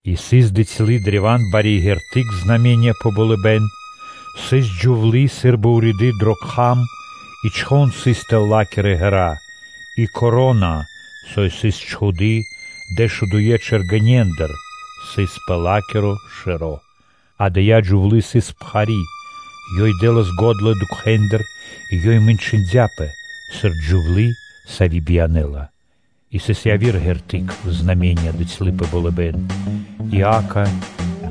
И сыс дыцьлы/бицялы древа́н бари ґерты́к (знаме́ниё) пэ болыбэ́н: сыс джувлы́ сы́рбы уриды дро кхам и чхон сыс тэл ла́кирэ ґэра́, и вя́нка (коро́на), сави́ сыс чхуды́ кхэтанэ́ дэшудуе́ чэргэнендыр, сыс пэ ла́киро шэро́. Адая джувлы́ сыс пхари́: ёй дэ́лас го́дла дукхэндыр и ёй мэнчындяпэ сыр джувлы́, сави́ биянэ́ла. И сыс яви́р ґерты́к дыцьлы/бицялы пэ болыбэ́н: и, акэ,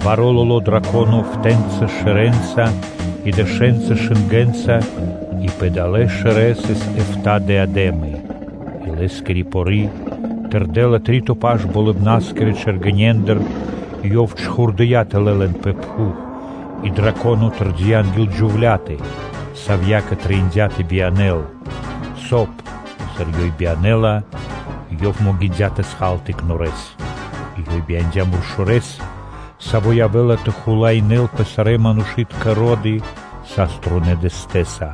баро́ лоло́ драконо эфта́ (эфтанэ) шэрэнца и дэшэнца шынгэнца и пэ далэ́ шэрэ́ сыс эфта́ диадэмы; и лэ́скири пори тырдэла три́то паш болыбна́скирэ чэргэнендыр и ёв чхурдыя́ тэлэ́ лэн пэ пхув. И драконо тэрдия́ анги́л джювлятэ, савьякэ трэиндя́ тэ биянэ́л, соб (кай), сыр ёй биянэ́ла, ёв могиндя́ тэ хал тыкнорэ́с. И ёй бияндя́ муршорэс, саво́ явэ́ла тэ хулаинэ́л пэ сарэ́ манушы́тка ро́ды саструнэ́ дэстэса.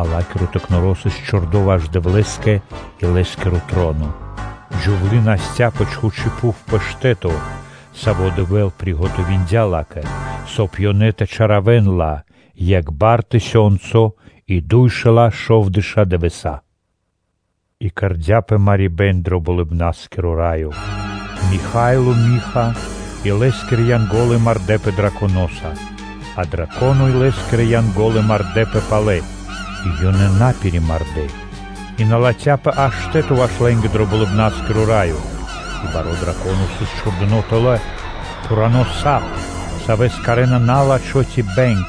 А ла́киро тыкноро сыс чхудо ваш Дэвлэ́скэ и Лэ́скиро троно. Джувлы́ насця пэ чхучи́ пхув пэ штэ́то, саво́ Дэвэ́л приготовиндя ла́кэ, соб (кай) ёнэ тэ чалякирэн ла екх бар и дуйшэла́ шовдэша́ дывэса́. И кэрдя́пэ марибэ́н дро Болыбна́скиро Раё. Михаило и лэ́скирэ Янго́лы мардэ́пэ драконоса. А драконо и лэ́скирэ Янго́лы мардэ́пэ палэ и лэ́нца: и ёнэ на пиримардэ, и на латхяпэ аж штэ́то ваш лэ́нгэ дро Болыбна́скиро Раё. И баро́ драконо сыс чхурдыно́ тэлэ́, пхурано́ сап, савэ́с кхарэ́на на́лачхо ци бэнг,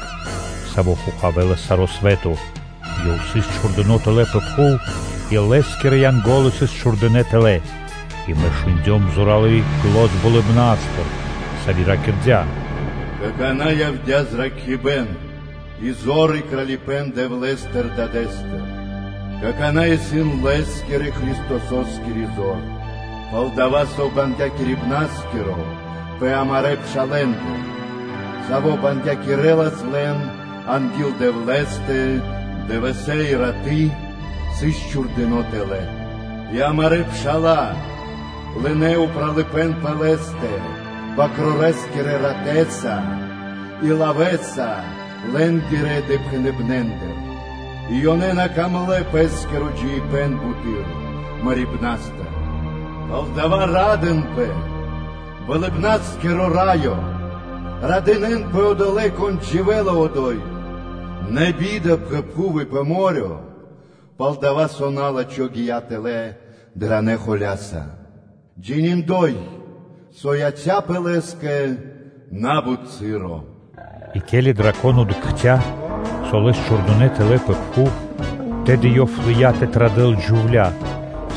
саво́ хохавэлас саро́ свэ́то. Ёв сыс чхурдыно́ тэлэ́ пэ пхув и лэ́скирэ Янго́лы сыс чхурдынэ́ тэлэ́. И мэ шундём зоралы́ зан болыбна́стыр, со ракирдя́: “Какана́ явдя́ зракхибэ́н и зор и Кралипэ́н Дэвлэ́стыр Дадэ́стыр. Какана́ исын Лэ́скирэ-Христососкири зор, пал-дова́ со бангякирибнаскиро пэ амарэ́ пшалэ́ндэ, саво́ бангякирэлас лэн анги́л Дэвлэ́стэ дывэсэ́ и раты́, сыс чхурдыно́ тэлэ́. И амарэ́ пша́ла лынэ́ упралыпэ́н пэ лэ́стэ свэнтонэ́ Бакрорэ́скирэ ратэ́са и лавэ́са лэ́нгирэ допхэныбнэндыр и ёнэ на дэ́нас чол (цэниндлэ) пэ́скиро джиибэ́н буты́р мэрибна́стыр. Палдава́ ра́дынпэ, Болыбна́скиро Раё! Радынэ́нпэ одолэ́, кон дживэ́ла одо́й! Нэ би́да пэ пхув и пэ мо́рё (дэрья́в), пал-дова́ со на́лачхо гия́ тэлэ́ даранэ холя́са, джининдой, со яця́пэ лэ́скэ на́бут часо. И ке́ли драконо дыкхця́, со лэс чхурдынэ́ тэлэ́ пэ пхув, тэды ёв лыя́ тэ традэл джувля́,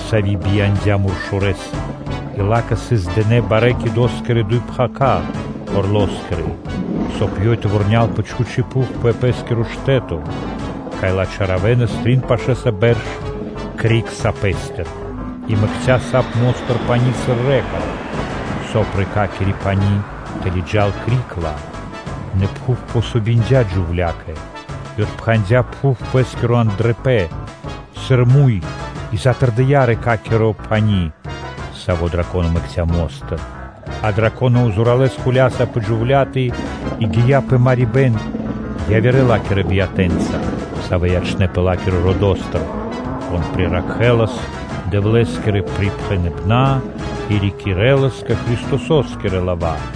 сави́ бияндя́ муршорэс. И ла́кэ сыс дынэ́ барэ́-орло́скирэ (кидо́скирэ) дуй пхака́ (крылы), соб (кай) ёй тэ вурнял пэ чхучи́ пхув пэ пэ́скиро штэ́то, кай ла чаравэнас трин пашэ́са бэрш криг сапэстыр. И мэкця́ сап мо́стыр пани́ сыр рэка (лэнь), соб (кай) рэкакири (лэнякири) пани́ тэ лыджа́л криг ла. Нэ пхув помогиндя джувля́кэ и псирадя (отпхандя) пхув пэ́скиро андрыпэн сы́рбы муй и затырдыя рэкакиро (лэнякиро) пани́, саво́ драконо мэкця́ мо́стыр. А драконо зоралэ́с холя́сыя пэ джувля́тэ и гия́ пэ марибэ́н явирэ ла́кирэ биятэнца, савэ́ ячнэ́пэ ла́кирэ родо́стыр, кон приракхэлас Дэвлэ́скирэ припхэныбэна́ и рикирэлас Христосо́скирэ лава́.